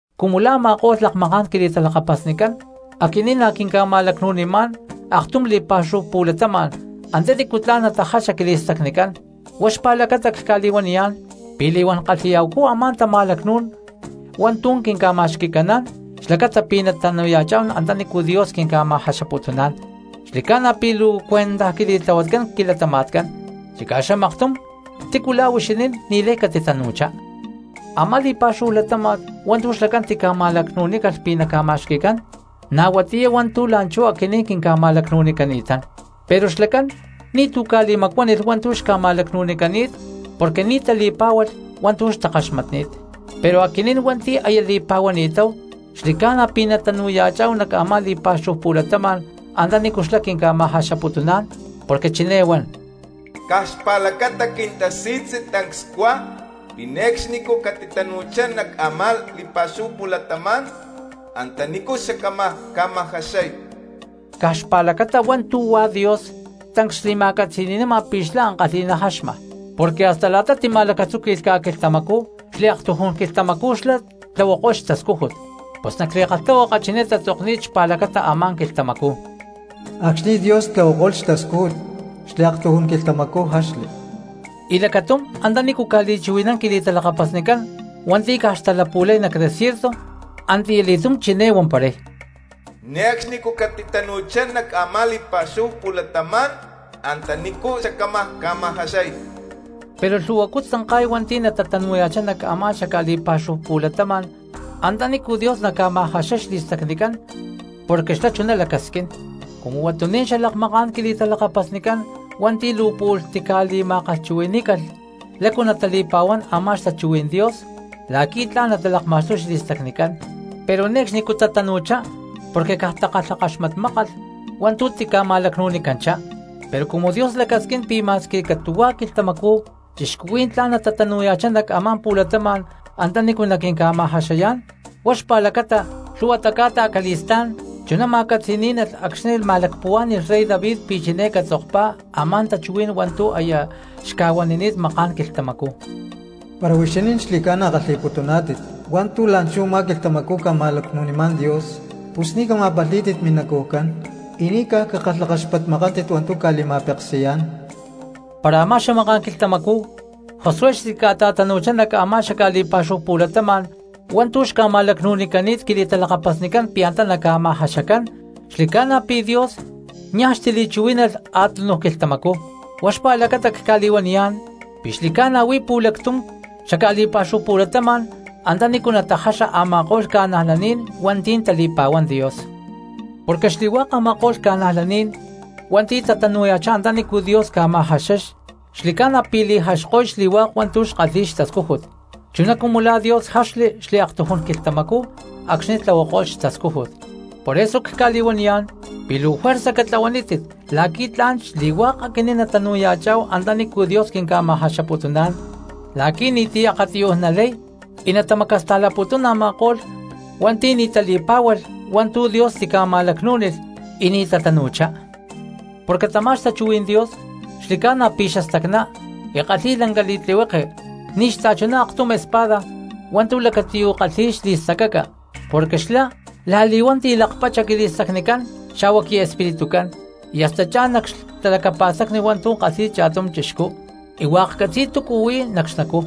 Cumu la̠ a̠ma̠ko̠lh lakmaká̠n quili̠talakapasnicán, aquinín na̠ quinca̠ma̠lacnu̠nimá̠n aktum li̠pa̠xúhu pu̠latama̠n antanícu tla̠n natajaxa quili̠stacnicán, huá xpa̠lacata cca̠li̠huaniyá̠n pi̠ li̠huán kalhi̠ya̠hucú a̠má tama̠lacnú̠n hua̠ntu̠ quinca̠ma̠xqui̠caná̠n xlacata pi̠ natanu̠ya̠cháhu antanícu Dios quinca̠ma̠jaxaputuná̠n, xli̠ca̠na pi̠ luu cuentaj quili̠tlahuatcán quilatama̠tcán, chicá xamaktum tícu la̠ huixinín ni̠lay catitanu̠chá. Amá li̠pa̠xúhu latáma̠t hua̠ntu̠ xlacán tica̠ma̠lacnu̠nícalh pi̠ naca̠ma̠xqui̠cán, na̠ huatiyá hua̠ntu̠ la̠nchú aquinín quinca̠ma̠lacnu̠nicani̠tán, pero xlacán ni̠tu̠ ca̠li̠macuánilh hua̠ntu̠ xca̠ma̠lacnu̠nicani̠t porque ni̠ tali̠pá̠hualh hua̠ntu̠ xtakaxmatni̠t. Pero aquinín hua̠nti̠ aya li̠pa̠huani̠táhu xli̠ca̠na pi̠ natanu̠ya̠chá̠hu nac a̠má li̠pa̠xúhu pu̠latama̠n antanícu xlá quinca̠ma̠jaxaputuná̠n porque chiné huan: Caj xpa̠lacata quintasi̠tzi tancs cuá pi̠ ne̠cxnicú catitatanu̠chá nac a̠má li̠pa̠xúhu pu̠latama̠n antanícu xacámaj ca̠ma̠jaxay. Caj xpa̠lacata hua̠ntu̠ huá Dios tancs xli̠ma̠catzi̠ni̠nama pi̠ xlá ankalhi̠ná jaxma, porque hasta la̠ta tima̠lacatzúqui̠lh ca̠quilhtamacú xliaktujún quilhtamacú xlá tlahuako̠lh xtascújut. Pus nac li̠kalhtahuaka chiné tatzokni̠t xpa̠lacata a̠má quilhtamacú: Acxni̠ Dios tlahuako̠lh xtascújut xliaktujún quilhtamacú jaxli. Y lacatum antanícu ca̠li̠chuhui̠nán quili̠talakapasnicán hua̠nti̠ caj xtalapu̠lay nac desierto antiyá li̠tum chiné huamparay: Ne̠cxnicú catitatanu̠chá nac a̠má li̠pa̠xúhu pu̠latama̠n antanícu xacámaj ca̠ma̠jaxay. Pero lhu̠huacú tzanka̠y hua̠nti̠ natatanu̠ya̠chá nac a̠má xaca̠li̠pa̠xúhu pu̠latama̠n antanícu Dios naca̠ma̠jaxay xli̠stacnicán porque xlá chuná lacasquín; cumu huatuní̠n xalakmaká̠n quili̠talakapasnicán hua̠nti̠ luu pu̠lh tica̠li̠ma̠kalhchuhui̠ní̠calh lácu natali̠pa̠huán a̠má xtachuhuí̠n Dios la̠qui̠ tla̠n natalakma̠xtuy xli̠stacnicán, pero ne̠cxnicú tatanu̠chá porque caj takalhakaxmatmákalh hua̠ntu̠ tica̠ma̠lacnu̠nicanchá. Pero cumu Dios lacasquín pi̠ ma̠squi catu̠hua̠ quilhtamacú cristianos tla̠n natatanu̠ya̠chá nac a̠má pu̠latama̠n antanícu naquinca̠ma̠jaxayá̠n, huá xpa̠lacata lhu̠huatá ca̠ta acali̠stá̠n chuná ma̠catzi̠ní̠nalh acxni̠ ma̠lacpuhuá̠ni̠lh rey David pi̠ chiné catzokpá a̠má tachuhuí̠n hua̠ntu̠ aya xca̠huanini̠t makán quilhtamacú. Para huixinín xli̠ca̠na kalhi̠putuná̠tit hua̠ntu̠ la̠nchú u̠má quilhtamacú ca̠ma̠lacnu̠nimá̠n Dios, pus ni̠ cama̠palhí̠tit minacujcán y ni̠ caj cakalhakaxpatmakántit hua̠ntu̠ ca̠li̠ma̠peksi̠yá̠n. Para a̠má xamaká̠n quilhtamacú Josué xtica̠ta̠tanu̠chá nac a̠má xaca̠li̠pa̠xúhu pu̠latama̠n hua̠ntu̠ xca̠ma̠lacnu̠nicani̠t quili̠talakapasnicán pi̠ antá naca̠ma̠jaxacán xli̠ca̠na pi̠ Dios niaj xtili̠chuhuí̠nalh a̠túnuj quilhtamacú. Huá xpa̠lacata cca̠li̠huaniyá̠n pi̠ xli̠ca̠na huí pu̠lactum xaca̠li̠pa̠xúhu pu̠latama̠n antanícu natajaxa a̠ma̠ko̠lh cristianos hua̠nti̠ tali̠pa̠huán Dios. Porque xli̠hua̠k a̠ma̠ko̠lh cristianos hua̠nti̠ tatanu̠ya̠chá antanícu Dios ca̠ma̠jaxay xli̠ca̠na pi̠ li̠jaxko̠y xli̠huak hua̠ntu̠ xkalhi̠y xtascújut, chuná cumu la̠ Dios jaxli xliaktujún quilhtamacú acxni̠ tlahuako̠lh xtascújut. Por eso cca̠li̠huaniyá̠n pi̠ luu juerza catlahuanítit la̠qui̠ tla̠n xli̠hua̠k aquinín natanu̠ya̠chá̠hu antanícu Dios quinca̠ma̠jaxaputuná̠n, la̠qui̠ ni̠ti̠ akatiyuj natalay y natamacasta̠laputún a̠ma̠ko̠lh hua̠nti̠ ni̠ tali̠pá̠hualh hua̠ntu̠ Dios tica̠ma̠lacnú̠nilh y ni̠ tatanu̠chá. Porque tamá xtachuhuí̠n Dios xli̠ca̠na pi̠ xastacná y kalhi̠y lanca li̠tlihueke ni̠ xachuná aktum espada hua̠ntu̠ lacatiyu̠ kalhi̠y xli̠stacaca, porque xlá la̠li̠huán tilakpacha quili̠stacnicán xa̠hua quiespiritucán, y hasta cha̠n nac xtalacapa̠stacni hua̠ntu̠ kalhi̠y cha̠tum cristiano y hua̠k catzi̠y túcu huí nac xnacú.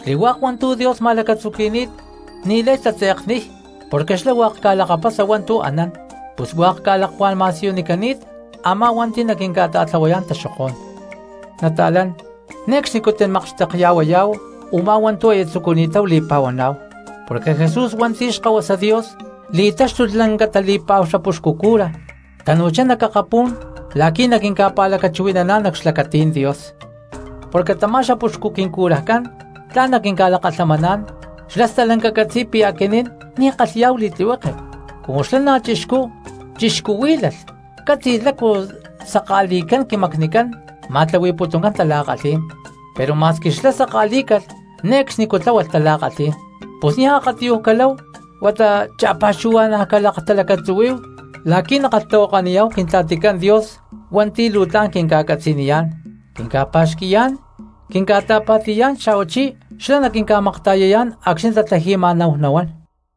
Xli̠hua̠k hua̠ntu̠ Dios ma̠lacatzuqui̠ni̠t ni̠lay tatze̠kniy, porque xlá hua̠k ca̠lakapasa hua̠ntu̠ anán; pus hua̠k ca̠lakuá̠n ma̠siyunicani̠t a̠má hua̠nti̠ naquinca̠ta̠tlahuayá̠n taxokó̠n. Nata̠lán, ne̠cxnicú timakxtekya̠huayá̠hu u̠má hua̠ntu̠ aya tzucuni̠táhu li̠pa̠huaná̠hu, porque Jesús hua̠nti̠ Xkahuasa Dios li̠táxtulh lanca tali̠pa̠hu xapuxcu cura, tanu̠chá nac akapú̠n la̠qui̠ naquinca̠pa̠lacachuhui̠naná̠n nac xlacatí̠n Dios. Porque tamá xapuxcu quincurajcán tla̠n naquinca̠lakalhamaná̠n, xlá stalanca catzi̠y pi̠ aquinín ni̠ kalhi̠yá̠hu li̠tlihueke; cumu xlá na̠ chixcú chixcuhuí̠lalh catzi̠y lácu saka̠li̠cán quimacnicán ma̠tlahui̠putuncán tala̠kalhí̠n, pero ma̠squi xlá saka̠lí̠calh ne̠cxnicú tláhualh tala̠kalhí̠n. Pus niaj akatiyuj caláhu huata cha̠pa̠xuhua̠na̠ calaktalacatzuhuí̠hu la̠qui̠ nakalhtahuakaniyá̠hu Quintla̠ticán Dios hua̠nti̠ luu tla̠n quinca̠catzaniyá̠n, quinca̠pa̠xqui̠yá̠n, quinca̠ta̠pa̠ti̠niyá̠n, xa̠huachí xlá naquinca̠makta̠yayá̠n acxni̠ tatlaji̠ma̠náhu nahuán.